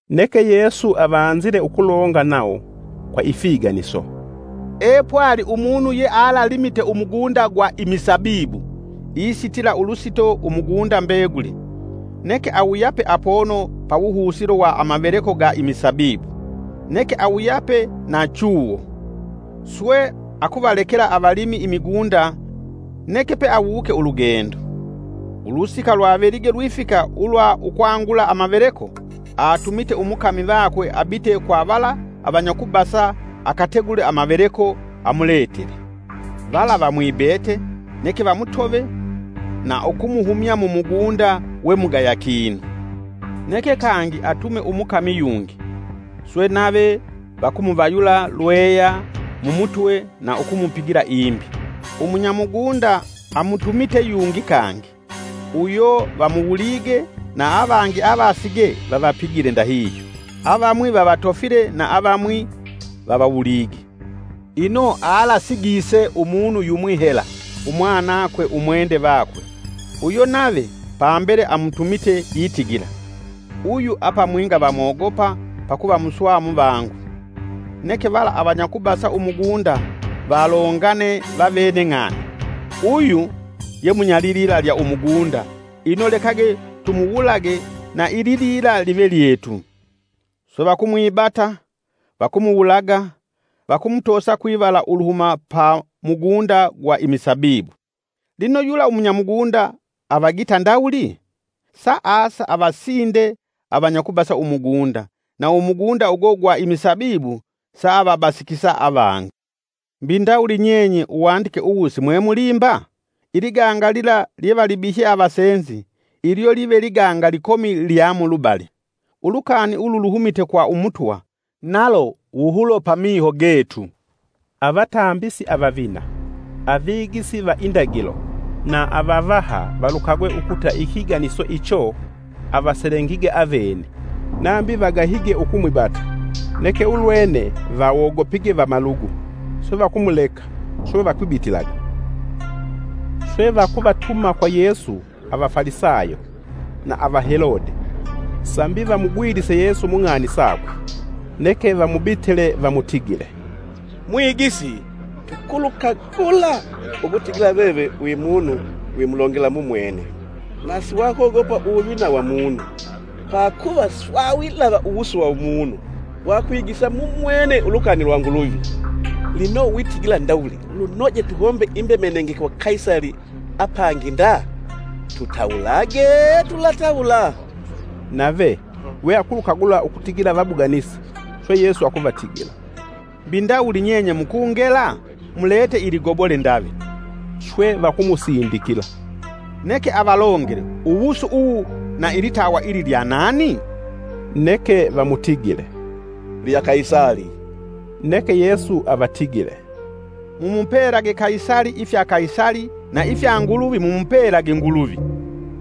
Neke Yesu avanzile ukulonga nawo kwa ifiganiso, “Epwali umunu yealalimite umugunda gwa imisabibu, isitila ulusito umugunda mbeguli. Neke awuyape apono pawuhusilo wa amaveleko ga imisabibu, neke awuyape na chuwo. Swe akuvalekela avalimi imigunda neke peawuke ulugendo. Ulusika lwavelige lwifika ulwa ukwangula amaveleko, atumite umukami vakwe abite kwa vala avanyakubasa, akategule amaveleko amuletele. Vala vamwibete, neke vamutove, na ukumuhumya mu mugunda we mugaya kinu. Neke kangi atume umukami yungi; swe nave vakumuvayula lweya mumutwe na ukumupigila imbi. Umunyamugunda amutumite yungi kangi, uyo vamuwulige na avangi avaasige vavapigile ndahihyo, avamwi vavatofile na avamwi vavawulige. Ino alasigise umunu yumwi hela, umwanakwe umwende vakwe. Uyo nave pambele amutumite itigila, ‘Uyu apamwinga vamwogopa pakuva muswamuvangu.’ Neke vala avanyakubasa umugunda valongane vavene ng'ani, ‘Uyu ye munya lilila lya umugunda, ino lekage tumuwulage, na ililila live lyetu!’ Swe vakumwibata, vakumuwulaga, vakumutosa kwivala uluhuma pa mugunda gwa imisabibu. “Lino yula umunyamugunda avagita ndawuli? Saasa avasinde avanyakubasa umugunda, na umugunda ugo gwa imisabibu saavabasikisa avangi. Mbi ndawuli nyenye Uwandike uwu simwemulimba? ‘Iliganga lila lyevalibihye avasenzi, ilyo live liganga likomi lya mulubali. Ulukani ulu luhumite kwa Umutwa, nalo wuhulo pamiho getu.’” Avatambisi avavina, avigisi va indagilo na avavaha valukagwe ukuta ikiganiso icho avaselengige avene. Nambi vagahige ukumwibata, neke ulwene vawogopige vamalugu. Swe vakumuleka, swe vakwibitilaga. Swe vakuvatuma kwa Yesu Avafalisayo na Avahelode, sambi vamugwilise Yesu mu ng'ani sakwe. Neke vamubitile vamutigile, “Mwigisi, tukulukagula ukutigila veve wi munu wimulongela mumwene, na siwakwogopa uwuvina wa munu. Pakuva siwawilava uwusu wa umunu wakwigisa mumwene ulukani lwa Nguluvi. Lino witigila ndawuli lunoje tuhombe imbemenenge kwa Kaisali apangi nda?” Tutawulage, tulatawula? Nave, we akulukagula ukutigila vabuganisi, swe Yesu akuvatigila, “Mbi ndawuli nyenye mukungela? Mlete iligobole ndave.” Swe vakumusindikila. “Neke avalongele uwusu uwu na ilitawa ili lya nani?” Neke vamutigile, “Lya Kaisali.” Neke Yesu avatigile, “Mumupelage Kaisali ifya Kaisali na ifya Nguluvi mumupelage Nguluvi.”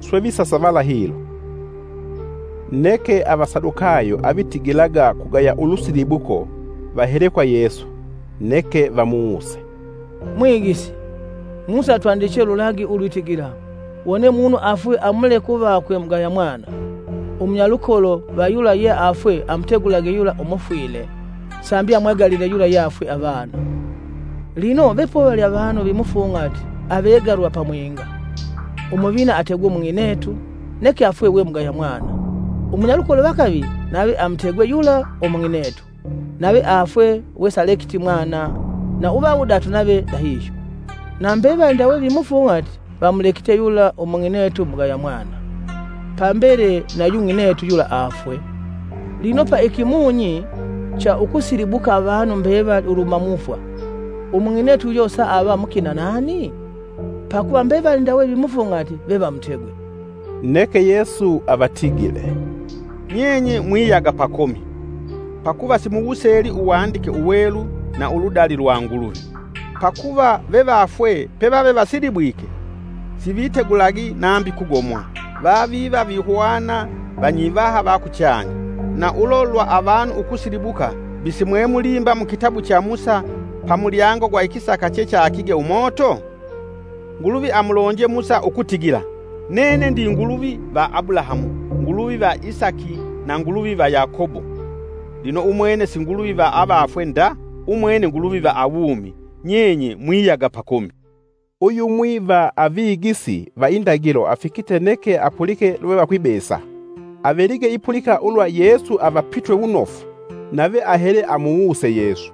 Swe visasavala hilo. Neke Avasadukayo avitigila kugaya ulusilibuko vahele kwa Yesu, neke vamuwuse, “Mwigisi, Musa atwandiche ululagi ulwitigila: ‘Wone umunu afwe amuleke uvakwe mugaya mwana, umunyalukolo va yula yeafwe amutegulage yula umufwile sambi amwegalile yula yeafwe avana.’ Lino vepovali avanu vimufung'ati avegalwa pamwinga. Umuvina ategwe umung'inetu, neke afwe we mugaya mwana. Umunyalukolo va kavili nave amutegwe yula umung'inetu, nave afwe wesalekiti mwana; na uva wudatu nave ndahihyo. Na mbevali ndawe vimufung'ati vamulekite yula umung'inetu mugaya mwana. Pambele nayu ng'inetu yula aafwe. Lino pa ikimunyi cha ukusilibuka avanu mbevali uluhuma mufwa, umung'inetu uyo saava mukina nani? Pakuva mbevali ndawe vimufung'ati vevamutegwe.” Neke Yesu avatigile, “Nyenye mwiyaga pakomi, pakuva simuwuseli uwandike uwelu na uludali lwa Nguluvi. Pakuva vevafwe pevave vasilibwike sivitegulagi nambi kugomwa; vaviva vihwana vanyivaha va kuchanya. Na ulo lwa avanu ukusilibuka mbi simwemulimba mukitabu cha Musa pa mulyango gwa ikisaka chechakige umoto? Nguluvi amulonje Musa ukutigila, ‘Nene ndi Nguluvi va Abulahamu, Nguluvi va Isaki na Nguluvi va Yakobo.’ Lino umwene si Nguluvi va avafwe nda, umwene Nguluvi va awumi. Nyenye mwiyaga pakomi.” Uyumwi va avigisi va indagilo afikite neke apulike lwevakwibesa. Avelige ipulika ulwa Yesu avapitwe wunofu, nave ahele amuwuse Yesu,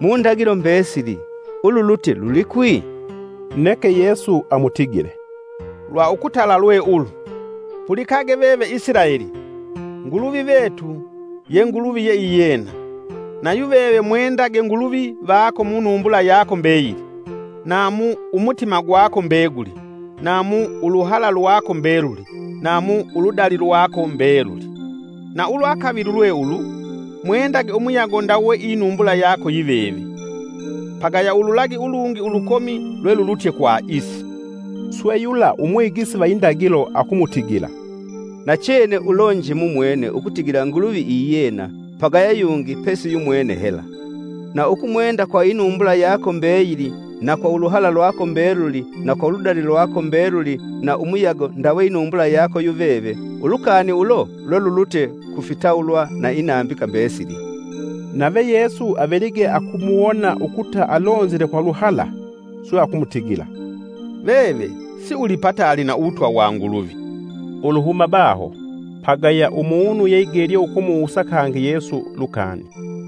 “Mundagilo mbesili ululutye lulikwi?” Neke Yesu amutigile, “Lwa ukutala lwe ulu: ‘Pulikage veve Isilaeli! Nguluvi vetu ye Nguluvi yeiyena. Nayuveve mwendage Nguluvi vako munumbula yako mbeyili, na mu umutima gwako mbeguli, na mu uluhala lwako mbeluli na mu uludali lwako mbeluli.’ Na ulwa kavili lwe ulu, ‘Mwendage umuyago ndawe inumbula yako yiveve.’ Pagaya ululagi ulungi, ulukomi lwelulutye kwa isi.” Swe yula umwigisi va indagilo akumutigila, “Nachene ulonje mumwene ukutigila Nguluvi iyena, pagaya yungi pesi yumwene hela. Na ukumwenda kwa inumbula yako mbeyili, na kwa uluhala lwako mbeluli na kwa uludali lwako mbeluli na umuyago ndawe inumbula yako yuveve, ulukani ulo lwelulutye ku fitawulwa na inambika mbesili.” Nave Yesu avelige akumuwona ukuta alonzile kwa luhala, swe akumutigila, “Veve siulipataali na uwutwa wa Nguluvi.” Uluhuma baho, pagaya umunu yeigelye ukumuwusa kangi Yesu lukani.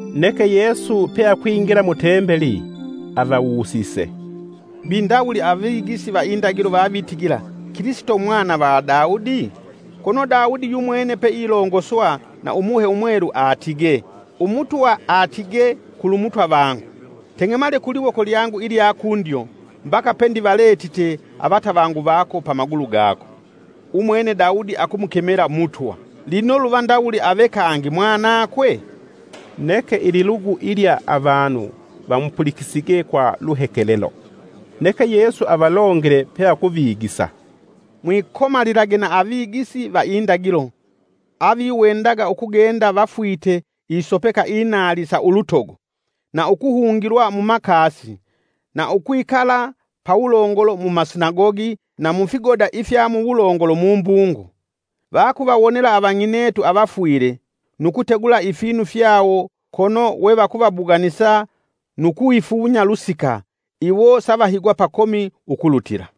Neke Yesu pe akwingila mu Tembeli. Avawusise, “Mbi ndawuli avigisi va indagilo vavitigila Kilisito Mwana va Daudi? Kono Daudi yumwene peilongoswa na Umuhe Umwelu atigee: ‘Umutwa atigee kulumutwa vangu. Teng'emale kuliwoko lyangu ilya kundyo, mbaka pendivaletite avatavangu vako pamagulu gako.’ “Umwene Daudi akumukemela Mutwa. Lino luva ndawuli ave kangi Mwanakwe?” Neke ililugu ilya avanu vamupulikisige kwa luhekelelo. Neke Yesu avalongele peakuvigisa, “Mwikomalilage na avigisi va indagilo, aviwendaga ukugenda vafwite isopeka inaali sa ulutogo, na ukuhungilwa mumakasi, na ukwikala pawulongolo mumasinagogi na mufigoda ifya muwulongolo mumbungo. Vakuvawonela avang'inetu avafwile, nu kutegula ifinu fyawo, kono we vakuvabuganisa nu kwifunya lusika, iwo savahigwa pakomi ukulutila.”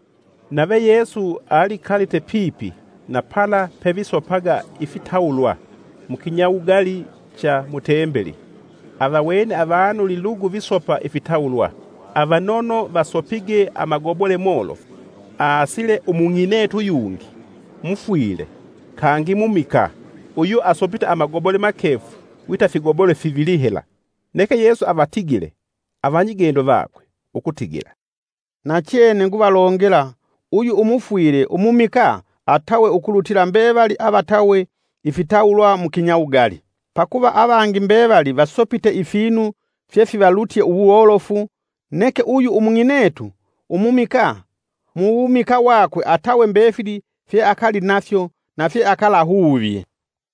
Nave Yesu alikalite pipi na pala pevisopaga ifitawulwa, mu kinyawugali cha mu tembeli avawene avanu lilugu visopa ifitawulwa. Avanono vasopige amagobole molofu. Aasile umung'inetu yungi, mufwile, kangi mumikaa, uyo asopite amagobole makefu wita figobole fivili hela. Neke Yesu avatigile, avanyigendo vakwe, ukutigila, “Nachene nguvalongela uyu umufwile umumikaa atawe ukulutila mbevali avatawe ifitawulwa mukinyawugali. Pakuva avangi mbevali vasopite ifinu fyefivalutye uwolofu, neke uyu umung'inetu umumikaa, muwumikaa wakwe atawe mbefili fyeakalinafyo, na fyeakalaahuvye.”